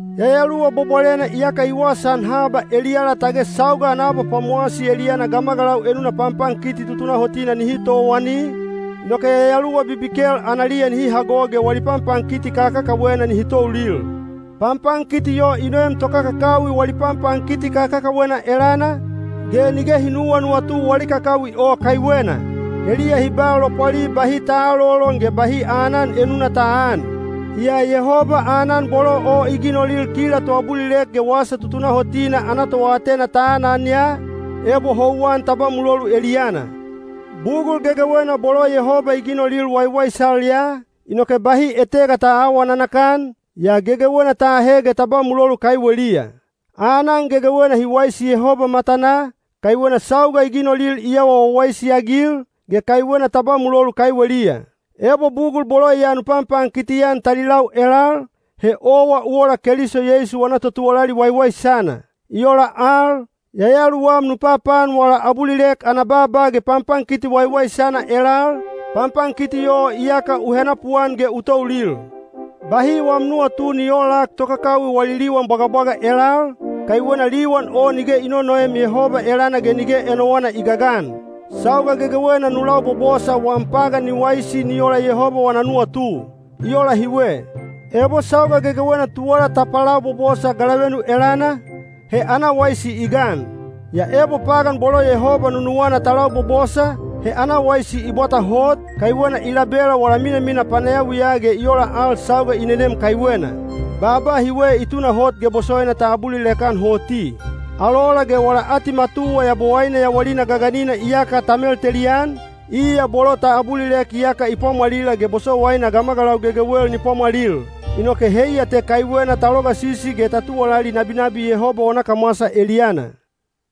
Yayaluwa Bwabwalena iyaka i wasaan haba eliyala tage sauga ana abapwamowasi eliyana gamagalau enuna panpankiti tutunahotina nihi towani, inoke yayaluwa bibikel analiya nihi hago ge wali panpankiti kakakawena nihi toulil. Panpankiti o i noem tokakakawi wali panpankiti kakakawena elana, ge nige hi nuwanuwatu wali kakawi o kaiwena. Heliya hi ba lopwali bahi ta aalolon ge bahi aanan enuna ta aan. Yaa Yehoba aanan bolo o i ginolil kila toabulilek ge wasa tutunahotina ana toatena ta anan ya, ebo houwan ta ba mulolu eliyana. Bugul gegewena bolo Yehoba i ginolil waiwaisal ya, inoke bahi etega ta aawa nanakan, yaa gegewena ta ahe ge ta ba mulolu kaiweliya. Aanan gegewena hi waisi Yehoba matanaa, kaiwena sauga i ginolil i awa wawaisi-agil, ge kaiwena ta ba mulolu kaiweliya. Ebo bugul bolo ya nu panpankiti-an talilau ge nulau elal, he owa u ola Keliso Yeisu wana totuwalali waiwaisana. I ola al, yayaluwam nu papaan wala abulilek ana baaba ge panpankiti waiwaisana elal, panpankiti o iyaka u henapuan ge u toulil. Bahi wam nuwatu ni oolak tokakawi wali liwan bwagabwaga elal, kaiwena liwan o nige i nonoem Yehoba elana ge nige enowana i gagan. Sauga gegewena nu labobosa wam pagan ni waisi ni ola Yehoba wana nuwatu. I ola hiwe: ebo sauga gegewena tuwala ta palabobosa galavenu elana, he ana waisi i gan. Yaa ebo pagan bolo Yehoba nunuwana ta labobosa, he ana waisi i bwata hot, kaiwena i labela wala minamina panayawiya ge i ola al sauga i nenem kaiwena. Baaba hiwe i tunahot ge bosowaina ta abulilek-an hoti: “Alola ge wala atimatuwa Yabowaine yawalina gaganina iyaka ta meltelian, iya bolo ta abulilek iyaka i pwamwalila ge bosowaina gamagalau gegewel ni pwamwalil.” Inoke heiya te kaiwena ta logasisi ge ta tuwalali nabinabi Yehoba wana kamwasa eliyana.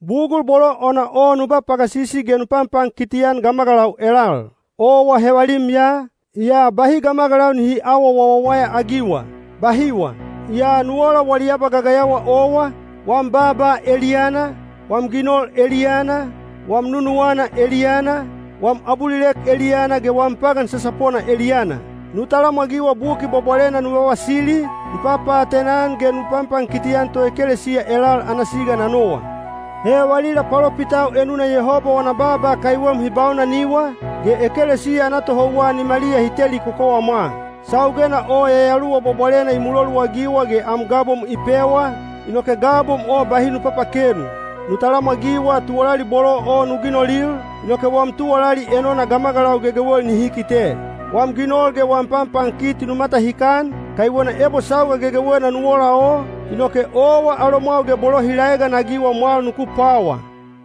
Bugul bolo ona o nu ba pagasisi ge nu panpankiti-an gamagalau elal. Owa hevalim ya, yaa bahi gamagalau nihi aawa wawawaya-agiwa. Bahiwa, yaa nu ola wali abagagayawa owa, wam baaba eliyana, wam ginol eliyana, wam nunuwana eliyana, wam abulilek eliyana ge wam pagan sasapona eliyana. Nu talamwagiwa Buki Bwabwalena nu vavasili, nu papaatena-an ge nu panpankiti-an toekelesiya elal ana siga na nowa. He valila palopitau enuna Yehoba wana baaba kaiwem hi baunaniwa, ge ekelesiya ana tohouwa nimaliya hi teli kokowamwa. Saugena o Yayaluwa Bwabwalena i muloluagiwa ge am gabom i pewa, inoke gabom o bahi nu papakenu. Nu talamwagiwa tuwalali bolo o nu ginolil, inoke wam tuwalali enona gamagalau gegewel nihi kite. Wam ginol ge wam panpankiti nu matahikan, kaiwena ebo sauga gegewena nu ola o, inoke owa alomwau ge bolo hi laeganagiwa mwal nuku pwawa.